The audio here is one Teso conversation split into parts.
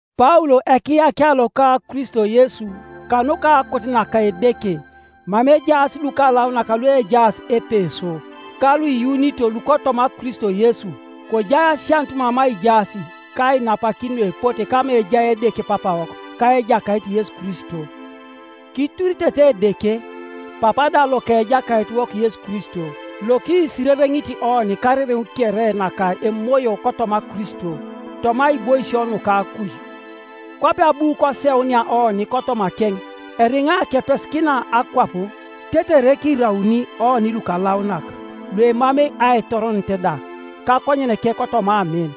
Paul ekiyakia loka Kristo Yesu kanuka akot naka Edeke, Mama ejaas lukalaunak luejaas Epeso, ka luiyuunito lukotoma Kristo Yesu: Kojai asianut mama ijaas ka ainapakin nuepote kama ejai Edeke Papawok ka Ejakait Yesu Kristo. Kituritete Edeke, Papa da loka Ejakaitiwok Yesu Kristo, lokisirereŋit oni karereŋ kere naka emoyo kotoma Kristo, toma aiboisio nuka akuj. Kwape abu koseunia oni kotomakeŋ eriŋa kepesikina akwap, tetere kirauni oni lukalaunak, luemamei aitoronet da, kakonyeneke kotoma amin.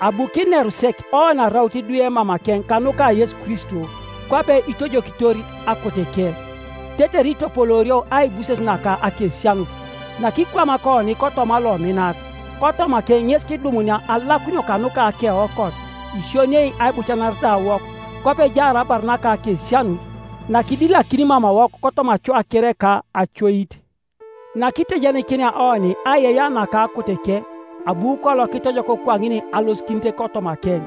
Abu kineru sek oni araut idwe mamakeŋ kanuka Yesu Kristo, kwape itojokitor akoteke, tetere itopoloorio aibuses naka akesianut, nakikwamak oni kotoma Lominat. Kotomakeŋ ŋes kidumunia alakunio kanuka akeokot, isioniei aibucanaretawok, kwape ejaar abar naka akesianut, nakidilakini mamawok kotoma acoa kere ka acoit, nakitejenikinia oni aiyeiyea naka akoteke. Abu kolo kitojok kwaŋin alosikinit kotomakeŋ,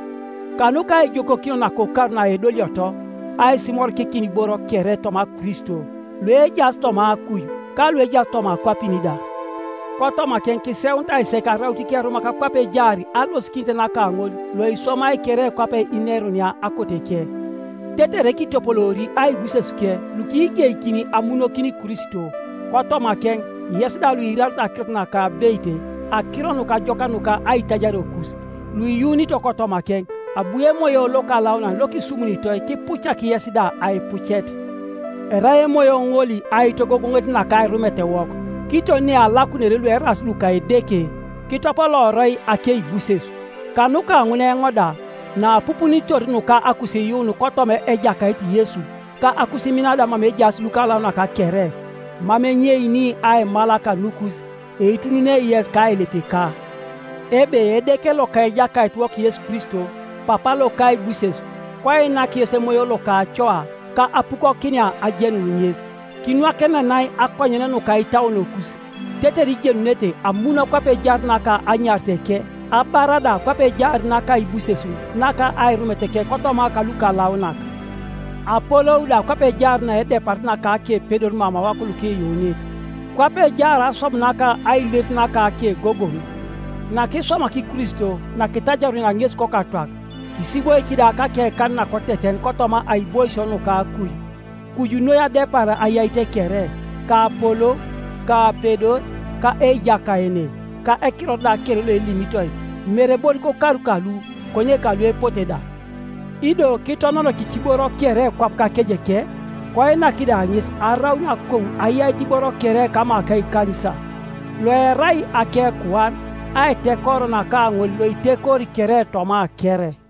kanuka aijokokinio nakokar naedolioto, aisimorikikin iboro kere toma Kristo, luejaas toma akuj, ka luejaas toma akwapin da. Kotomakeŋ kiseunitai sek araut ikerumak kwape ejaar alosikinit naka ŋol loiswamai kere kwape inerunia akoteke, tetere kitopoloori aibusesuke lukigeikini amunokin Kristo. Kotomakeŋ yes da luiirarito akirot naka abeit, Akiro Nukajokak nuka aitajariokus, luiyuunito kotomakeŋ, abu Emoyo Lokalaunan lokisumunitoi kipucak yes da aipucet. Erai Emoyo ŋol aitogogoŋet naka airumetewok, kiton nealakunere lueraas luka Edeke, kitopolooroi akeibuses. Kanuka ŋun eoŋ da, naapupunitor nuka akusiiyuun kotoma Ejakait Yesu, ka akusimin da mama ejaas lukalaunak kere, mam enyeini aimal kanukus, eitununei yes kailipika, ebe Edeke loka Ejakaitiwok Yesu Kristo, Papa loka aibuses, koinak yes emoyo loka acoa ka apukokinia ajenun ŋes, kinwakenenai akonyen nuka itauonokus, tetere ijenunete amun kwape ejaar naka anyariteke, abar da kwape ejaar naka aibuses naka airumeteke kotoma kalukalaunak, apolou da kwape ejaar naedeparit naka akepedor mamawok lukiyuunit, kwape ejaar aswam naka ailerit naka akegogoŋ, nakiswamak Kristo nakitajarunia ŋes kokatwak, kisiboik da kakekan nakoteten kotoma aiboisio nuka akuj, kuju noi adepar ayait kere, ka apolou, ka apedor, ka ejakaene, ka ekiror da kere loelimitoi, mere bon kokar kalu konye kaluepote da; ido kitononokik iboro kere kwap kakejeneke, koinak da ŋes araun akou ayait iboro kere kama ka ekanisa, loerai akekuan, aitekoro naka ŋol loitekori kere toma kere.